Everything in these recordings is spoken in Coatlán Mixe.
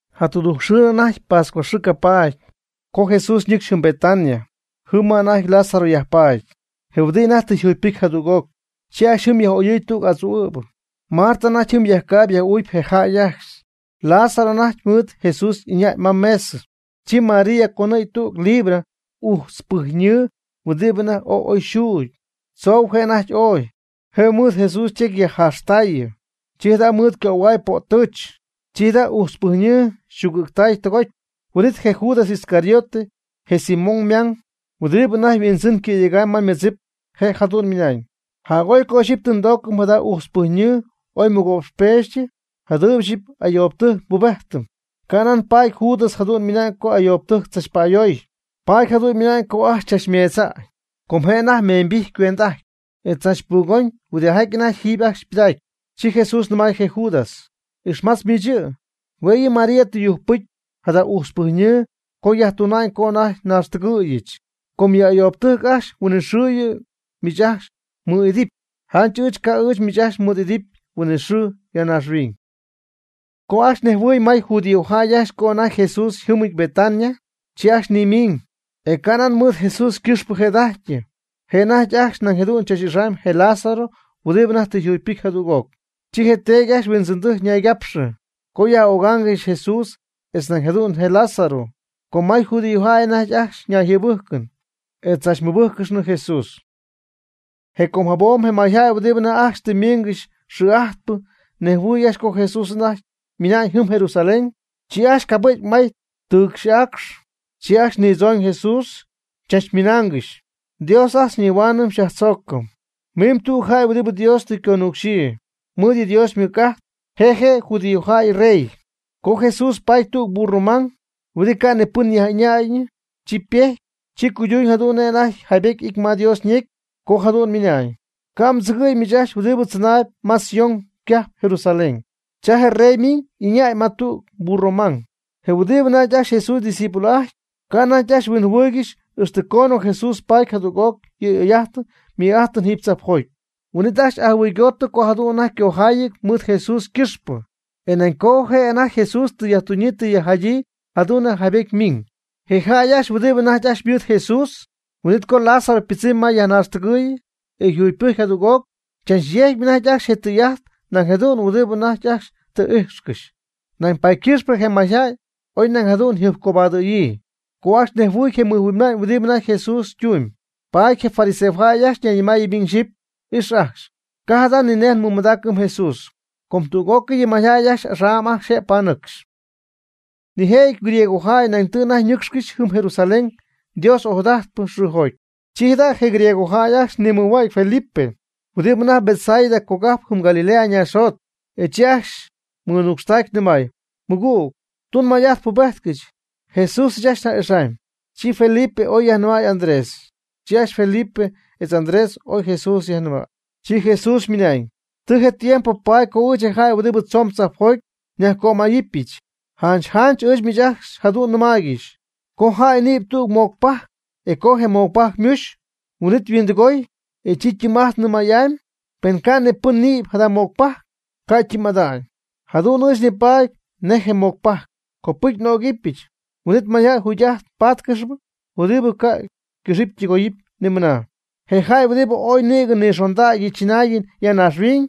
Jatudujcxɨɨnɨ anajty pascuaxɨɨ ca' paady, co Jesús ñɨcxy jɨm Betania, jɨm ma anajty Lázaro yajpaady, je huɨdi anajty tɨ yajjugypɨcy jadüg'oc. Chi ajcxy jɨm yaj'oyɨɨy tüg adzu'ɨ̈bɨ. Marta anajty jɨm yajcaayb yaj'uucp je jäy ajcxy. Lázaro anajty mɨɨd Jesús ɨñäy ma je mesɨ. Chi María conɨ̈gy tüg libra ujtzpɨjyñɨɨ huɨdibɨ anajty ooy oy yxuugy. Tzou je' anajty ooy, je' mɨɨd Jesús ytecy yajjaaxtaayɨ. Chi jada' mɨɨd ycöhuay po'ttɨɨch. Chi ac ujtzpɨjyñɨɨ yxuugɨ̈tay tɨgoty. Huin'it je Judas Iscariote je Simón ymang huɨdibɨ anajty yhuindzɨn cɨ̈yegam ma ymɨdzip, je' jadu'n ymɨna'ñ: ―Jac'oy co ixyipy tɨ ndoocɨm jada ujtzpɨjyñɨɨ oy mɨgo'pxpeexytɨ jadɨɨb ixyipy ajt ayoobtɨjc nbubejtɨm. Canan paady Judas jadu'n ymɨnañ co ayoobɨtɨjc tzachpa'ayoy. Paady jadu'n ymɨnañ co ajcxy chachmeedza'ñ. Com je' anajty meeñybijty cuend'ajtp, e chachpuugomyb huɨdijaty anajty jiiby ajcxy yjapɨdaacyp. Chi Jesús nɨmay je Judas: ―Ixmatz miich yɨ', hue' yɨ' yɨ María tɨ yujcpɨcy jada ujtzpɨjyñɨɨ co yajtuna'ñ co anajty naaxtɨgɨ̈yɨch. Com yɨ ayoobɨtɨjc ajcxy huinɨxɨɨ yɨ' miich ajcxy mɨɨd'idɨpy. Janch ɨɨch ca' ɨɨch miich ajcxy mɨɨd n'idɨpy huinɨxɨɨ (ya naaxhuiñ). Co ajcxy nejhuɨɨy may judíojäy ajcxy co anajty Jesús yjɨmɨty Betania, chi ajcxy nimiiñ. E canan mɨɨd Jesús ycɨxpɨ jëda'ajty, je' anajty ajcxy nañ jadu'n chach'ixaamy je Lázaro huɨdibɨ anajty tɨ jugypɨcy jadüg'oc. Chi je teedy ajcxy yhuindzɨndɨjc ñaygapxɨ, co yaj'ögaangɨxy Jesús etz nañ jadu'n je Lázaro, com may judíojäy ajcxy anajty ñayjɨɨbɨjcɨn, etz tzachmɨbɨjccɨxnɨ Jesús. Je com jabom je mayjäy huɨdibɨ anajty ajcxy tɨ ymiingɨxy xɨɨ'ajtpɨ ñejhuɨɨy ajcxy co Jesús anajty ymina'ñ jɨm Jerusalén. Chi ajcxy cabɨ̈gy may ytɨɨxy y'aacx, chi ajcxy nidzooñ Jesús, chachmɨnaangɨxy: ―¡Dios ajt xyñihuaanɨm xyajtzoocɨm! Mimb tüg jäy huɨdibɨ Dios tɨ yconucxyii. Ymɨɨd yɨ' Dios ymɨc'ajt, je' je' je judíojäy yrey. Co Jesús paty tüg burro mang huɨdibɨ ca' ni pɨn yaj'ɨñaayñɨ, chi yajpejty, chi cuyduuñ jadu'n nej anajty jaybety y'ity ma Dios ñecy co jadu'n ymɨnañ: ―Ca' mdzɨgɨ̈y miich ajcxy huɨdibɨ tzɨnaayb ma Sión cajp (Jerusalén). Cha je mrey ymiñ y'ɨñäy ma tüg burro mang. Je huɨdibɨ anajty ajcxy Jesús discípulo'ajtyp, ca' anajty ajcxy huinjɨhuɨɨygɨxy ixtɨ coonɨ Jesús paty jadüg'oc yɨ' y'oy'ajtɨn ymɨj'ajtɨn jiiby tzajpjoty. Huin'it ajcxy ajɨhuɨygootɨ co jadu'n anajty ycojaayɨty mɨɨd Jesús ycɨxpɨ, e nañ co je' anajty Jesús tɨ yajtunyii tɨ yajjadyii jadu'n nej jaybety ymiñ. Je jäy ajcxy huɨdibɨ anajty ajcxy ymɨɨd Jesús, huin'it co Lázaro ypɨdzɨmy ma yajnaaxtɨgɨɨyɨ, e yajjugypɨjcɨ jadüg'oc, chachyejcyp anajty ajcxy tɨy'ajt nañ jadu'n huɨdibɨ anajty ajcxy tɨ ijxcɨxy. Nañ paady ycɨxpɨ je mayjäy oy nañ jadu'n yjɨjpcobadɨ̈yii, co ajcxy nejhuɨy je mɨjhuinma'ñ huɨdibɨ anajty Jesús ytumyb. Paady je fariseojäy ajcxy ñayñɨmaayɨ miñ xyɨpy: ―Ix ajcxy, ca' jada' ninej nmɨmadaacɨm Jesús, com tüg'ócɨy yɨ mayjäy axam ajcxy je' panɨcxcɨxy. Nijëjɨty griegojäy nañ tɨ anajty ñɨcxcɨxy jɨm Jerusalén Dios ojadajtpɨ xɨɨjoty. Chi jada' je griegojäy ajcxy nimɨjhuägy Felipe, huɨdibɨ anajty Betsaida cogajp jɨm Galilea naaxjot, e chi ajcxy mɨnucxtaacy nɨmay: ―Mɨgüg, tun may'ajt pubejtcɨch, Jesús ɨɨch ajcxy nja'ixamy. Chi Felipe oy yajnɨmay Andrés, chi ajcxy Felipe etz Andrés oy Jesús yajnɨmay. Chi Jesús ymɨnañ: ―Tɨ je tiempo paady co ɨɨch je jäy huɨdibɨ tzoon tzajpjoty nyajcömayɨpyɨch. Janch janch ɨɨch miich ajcxy jadu'n nɨmaaygɨxy co jäy nïby tüg mocpajc, e co je mocpajc ymuxy, huin'it yhuindɨgoy, e chi ytɨɨm'ajtnɨ may'amy. Pen ca' ni pɨn nïby jada mocpajc, ca' ytɨɨm'ada'ñ. Jadu'n ɨɨch nipaady nej je mocpajc. Copɨcy n'ögɨbyɨch, huin'it mayjäy jugy'ajtɨn paadaangɨxy huɨdibɨ ca' ycɨxɨpy ytɨgoyɨpy ni mɨna. Je jäy huɨdibɨ ooy nïgɨ nixondägy yɨ chɨnaayɨn ya naaxhuiñ,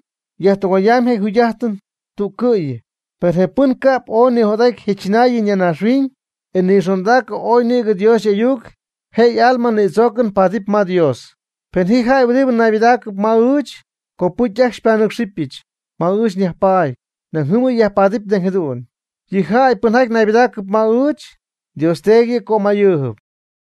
yajtɨgoyamy je' yjugy'ajtɨn tüccɨ'yɨ. Per je pɨn ca'p ooy nijot'aty je chɨnaayɨn ya naaxhuiñ, e nixondaacɨ ooy nïgɨ Dios y'ayuc, je' y'alma nïdzoocɨn paadɨp ma Dios. Pen ji jäy huɨdibɨ naybɨdaacɨp ma ɨɨch, copɨcy ajcxy xypanɨ́cxɨbɨch. Ma ɨɨch nyajpaady, nañ jɨm yɨ' yajpaadɨpy nañ jadu'n. Yɨ jäy pɨnjaty naybɨdaacɨp ma ɨɨch, Dios Teedy yɨ' cömayɨɨb.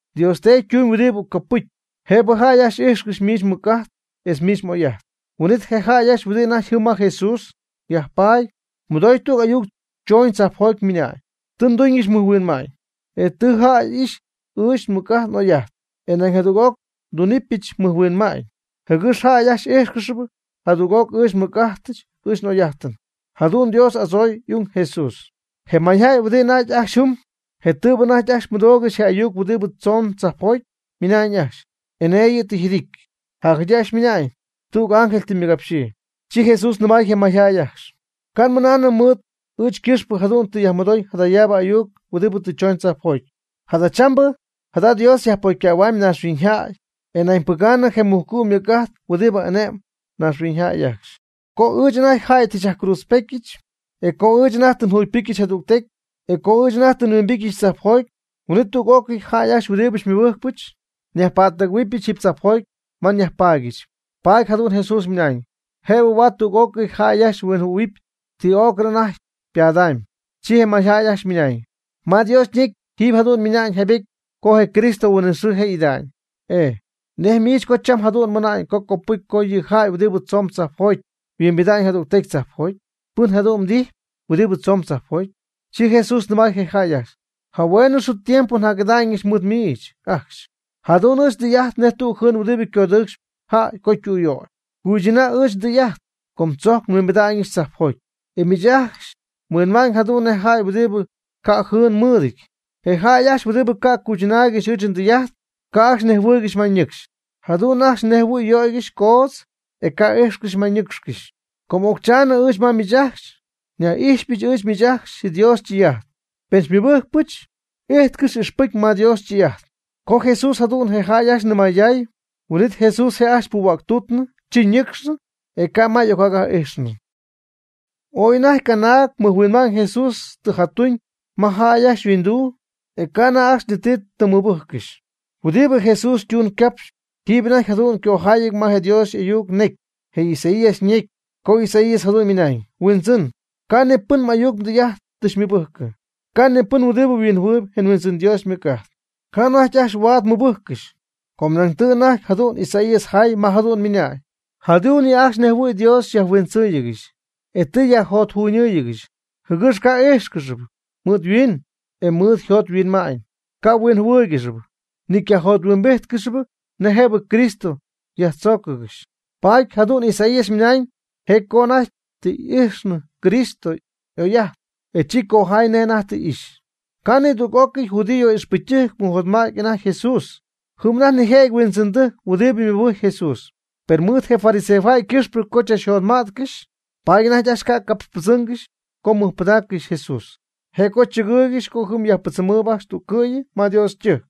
Dios Teedy tun huɨdibɨ copɨcy, jëbɨ jäy ajcxy ijxcɨxy miich mmɨc'ajt etz miich m'oy'ajt. Huin'it je jäy ajcxy huɨdi anajty jɨm ma Jesús yajpaady mɨdooy tüg ayuc choñ tzajpjoty ymɨnañ: ―Tɨ nduñɨch mɨjhuinma'ñ, e tɨ jäy ixy ɨɨch nmɨc'ajt n'oy'ajt. E nañ jadüg'oc ndunɨpyɨch mɨjhuinma'ñ, jɨgɨx jäy ajcxy íjxcɨxɨpy jadüg'oc ɨɨch nmɨc'ajt ɨɨch n'oy'ajt (jadu'n Dios y'adzooy y'ung Jesús). Je mayjäy huɨdibɨ anajty ajcxy jɨm, je tɨɨbɨ anajty ajcxy mɨdoogɨxy je ayuc huɨdibɨ tzoon tzajpjoty, ymɨnañ ajcxy: ―Enee yɨ' tɨ yjidity. Jacjadyii ajcxy ymɨnaañ: ―Tüg ángel tɨ ymɨgapxyii. Chi Jesús nɨmay je mayjäy ajcxy: ―Ca' nmɨnaanɨm mɨɨd ɨɨch ycɨxpɨ jadu'n tɨ yajmɨdoy jadayaabɨ ayuc huɨdibɨ tɨ chooñ tzajpjoty. Jadachambɨ jada' Dios yajpocycähua'ñ naaxhuiñyjäy, e nañ ypɨgaanɨpy je mujcu' ymɨc'ajt huɨdibɨ ane'mb naaxhuiñyjäy ajcxy. Co ɨɨch anajty jäy tɨ xyajcruudzpetyɨch, e co ɨɨch anajty tɨ njugypɨcyɨch jadügtecy, e co ɨɨch anajty tɨ nhuimbityɨch tzajpjoty, huin'it tüg'ócɨy jäy ajcxy huɨdibɨ xymɨbɨjcpɨch, nyajpa'ttɨgɨ̈huɨbɨch jiiby tzajpjoty ma nyajpaadyɨch. Paady jadu'n Jesús ymɨnañ, jëbɨ huaad tüg'ócɨy jäy ajcxy huinjɨhuɨ̈huɨp ti o'cɨn anajty ypadamy. Chi je mayjäy ajcxy ymɨnañ: ―Ma Dios ñecy jiiby jadu'n ymiñ jaybety co je Cristo huinɨxɨɨ je' y'ida'ñ. E ¿nej miich co cham jadu'n mɨna'ñ co copɨcy co yɨ jäy huɨdibɨ tzoon tzajpjoty, huimbidam jadügtecy tzajpjoty? ¿Pɨn jëdu'n mdijyp huɨdibɨ tzomb tzajpjoty? Chi Jesús nɨmay je jäy ajcxy: ―Jahueenɨ xɨɨ tiempo njac'ida'ñɨch mɨɨd miich ajcxy. Jadu'n ɨɨch ndɨy'ajt nej tüg jɨɨn huɨdibɨ codɨɨcxp jäy co ytüyöy. Cuychɨnäy ɨɨch ndɨy'ajt, co tzojc nhuimbida'ñɨch tzajpjoty, e miich ajcxy mhuɨ'ma'ñ jadu'n nej jäy huɨdibɨ ca' jɨɨn mɨɨdɨty. Je jäy ajcxy huɨdibɨ ca' cuychɨnaaygɨxy ɨɨch ndɨy'ajt, ca' ajcxy nejhuɨɨygɨxy ma ñɨcxcɨxy. Jadu'n ajcxy nej jɨhuɨ̈y yöygɨxy coodz, e ca' ijxcɨxy ma ñɨcxcɨxy. Com occhaani ɨɨch ma miich ajcxy, nyaj'ixpɨjcyp ɨɨch miich ajcxy Dios ytɨy'ajt. Pen xymɨbɨ́jccɨxpɨch, m'íjtcɨxɨp ixpɨcy ma Dios ytɨy'ajtɨn. Co Jesús jadu'n je jäy ajcxy nɨmayday, huin'it Jesús je' ajcxy puhua'ctuutnɨ, chi ñɨcxnɨ, e ca' ma y'ocjac'ijxɨn. Ooy anajty canaag mɨjhuinma'ñ Jesús tɨ jatuuñ ma jäy ajcxy yhuinduu, e ca' anajty ajcxy ni ti tɨm mɨbɨjccɨxy. Huɨdibɨ Jesús ytun ycapx, jiiby anajty jadu'n ycojayɨty ma je Dios y'ayuc necy, je Isaías ñecy, co Isaías jadu'n ymɨnañ: Huindzɨn, ca' ni pɨn ajt n'ayuc ndɨy'ajt tɨ xymɨbɨjcɨm. Ca' ni pɨn huɨdibɨ huinjɨhuɨɨyb je Huindzɨn Dios ymɨc'ajt. Ca' anajty ajcxy huaad ymɨbɨjccɨxy, com nañ tɨ anajty jadu'n Isaías jay ma jadu'n ymɨnañ: Jadu'n yɨ' ajcxy nej jɨhuɨ̈y Dios tɨ yajhuindzɨɨygɨxy, e tɨ yajjotjunɨɨygɨxy, jɨgɨx ca' y'íjxcɨxɨpy mɨɨd yhuiin, e mɨɨd yjot yhuinma'ñ ca' huinjɨhuɨ́ɨyɨgɨxyɨpy, ni ycajothuimbíjtcɨxɨpy nej jëbɨ Cristo yajtzóocɨgɨxy. Paady jadu'n Isaías ymɨnañ je' co anajty tɨ ijxɨ Cristo y'oy'ajt, e chi cojay nej anajty tɨ ixy. Ca' nidüg'ócɨy judío ixpɨcytɨjc mɨjotmädy anajty Jesús. Jɨm anajty nijëjɨty huindzɨndɨjc huɨdibɨ mɨbɨjcp Jesús. Per mɨɨd je fariseojäy ycɨxpɨ co chachjotma'tcɨxy, paady anajty ajcxy ca' capxpɨdzɨmgɨxy co mɨjpɨdaaccɨxy Jesús. Je' co chɨgɨɨygɨxy co jɨm yajpɨdzɨmɨɨyb ajcxy tüccɨ'yɨ ma Dios ytɨjc,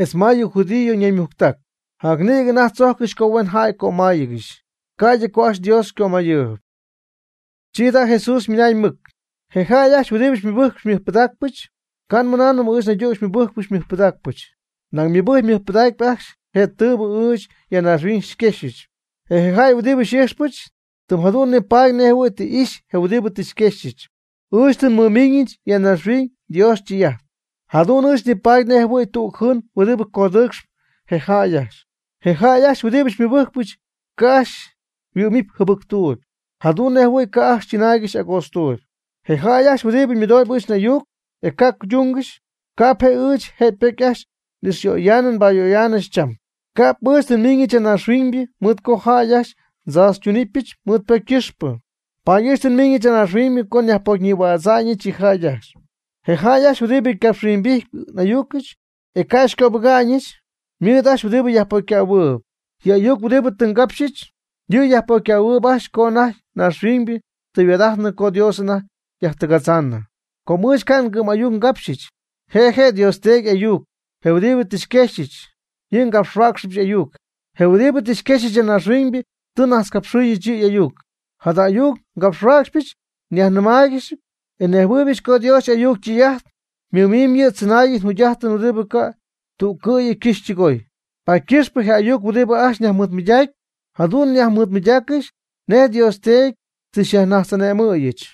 etz ma yɨ judío ñaymujctac. Jacnïgɨ anajty tzojccɨxy co huen jäy cömáayɨgɨxy, ca'ydɨ co ajcxy Dios ycömayɨɨyb. Chi jada' Jesús ymɨnañ mɨc: ―Je jäy ajcxy huɨdibɨ xymɨbɨjcpɨch xymɨjpɨdaacpɨch, camɨnaanɨm ɨɨch naydüg xymɨbɨjcpɨch xymɨjpɨdaacpɨch, nañ ymɨbɨjcyp ymɨjpɨdacyp ajcxy je tɨɨbɨ ɨɨch ya naaxhuiñ xyquexyɨch. E je jäy huɨdibɨ xy'ijxpɨch, tɨm jadu'n nipaady nej jɨhuɨ̈y tɨ ixy je huɨdibɨ tɨ xyquexyɨch. Ɨɨch tɨ nmɨmiiñɨch ya naaxhuiñ Dios ytɨy'ajt, jadu'n ɨɨch nipaady nej jɨhuɨ̈y tüg jɨɨn huɨdibɨ codɨɨcx je jäy ajcxy. Je jäy ajcxy huɨdibɨ xymɨbɨjcpɨch ca' ajcxy yhuɨ'mɨpy jɨbɨctuuby, jadu'n nej jɨhuɨ̈y ca' ajcxy chɨnaaygɨxy agootztuuby. Je jäy ajcxy huɨdibɨ mɨdoob ɨɨch n'ayuc, e ca' cuydungɨxy, ca'p je' ɨɨch je' ypocy ajcxy n'ixyöyaanɨ nbayöyaanɨ cham. Ca'p ɨɨch tɨ nmiiñɨch ya naaxhuiñ mɨɨd co jäy ajcxy ndzaachytunɨpyɨch mɨɨd ypocy ycɨxpɨ. Paady ɨɨch tɨ nmiiñɨch ya naaxhuiñ co nyajpocyñïhuädza'ñɨch yɨ jäy ajcxy. Je jäy ajcxy huɨdibɨ xycapxhuimbíjtɨbɨch n'ayuc, e ca' xycöbɨga'ñɨch, ymɨɨd ajcxy huɨdibɨ yajpocycähuɨɨb. Yɨ ayuc huɨdibɨ tɨ ngapxyɨch, yɨ' yajpocycähuɨɨb ajcxy co anajty naaxhuiñybɨ tɨ yhuaad'ajtnɨ co Dios anajty yajtɨgatzaanɨ. Com ɨɨch ca' ngɨ'm'ayuc ngapxhuäcxyɨch. Je' je' Dios Teedy y'ayuc, je huɨdibɨ tɨ xyquexyɨch, yɨ' ngapxhuäcxɨbɨch y'ayuc. Je huɨdibɨ tɨ xyquexyɨch ya naaxhuiñ tɨ xyñajtzcapxɨɨyɨch yɨ' y'ayuc, jada ayuc ngapxhuäcxypɨch nyajnɨmaaygɨxyp. E nejhuɨɨybɨch co Dios y'ayuc ytɨy'ajt ymɨmimyb yɨ' tzɨnaayɨn jugy'ajtɨn huɨdibɨ ca' tüccɨ'yɨ ycɨxy ytɨgoy. Paady ycɨx je ayuc huɨdibɨ ajcxy nyajmɨɨdmɨydacyp, jadu'n nyajmɨɨdmɨydaaccɨxy nej Dios Teedy tɨ xyajnajtz'ane'mɨ̈yɨch.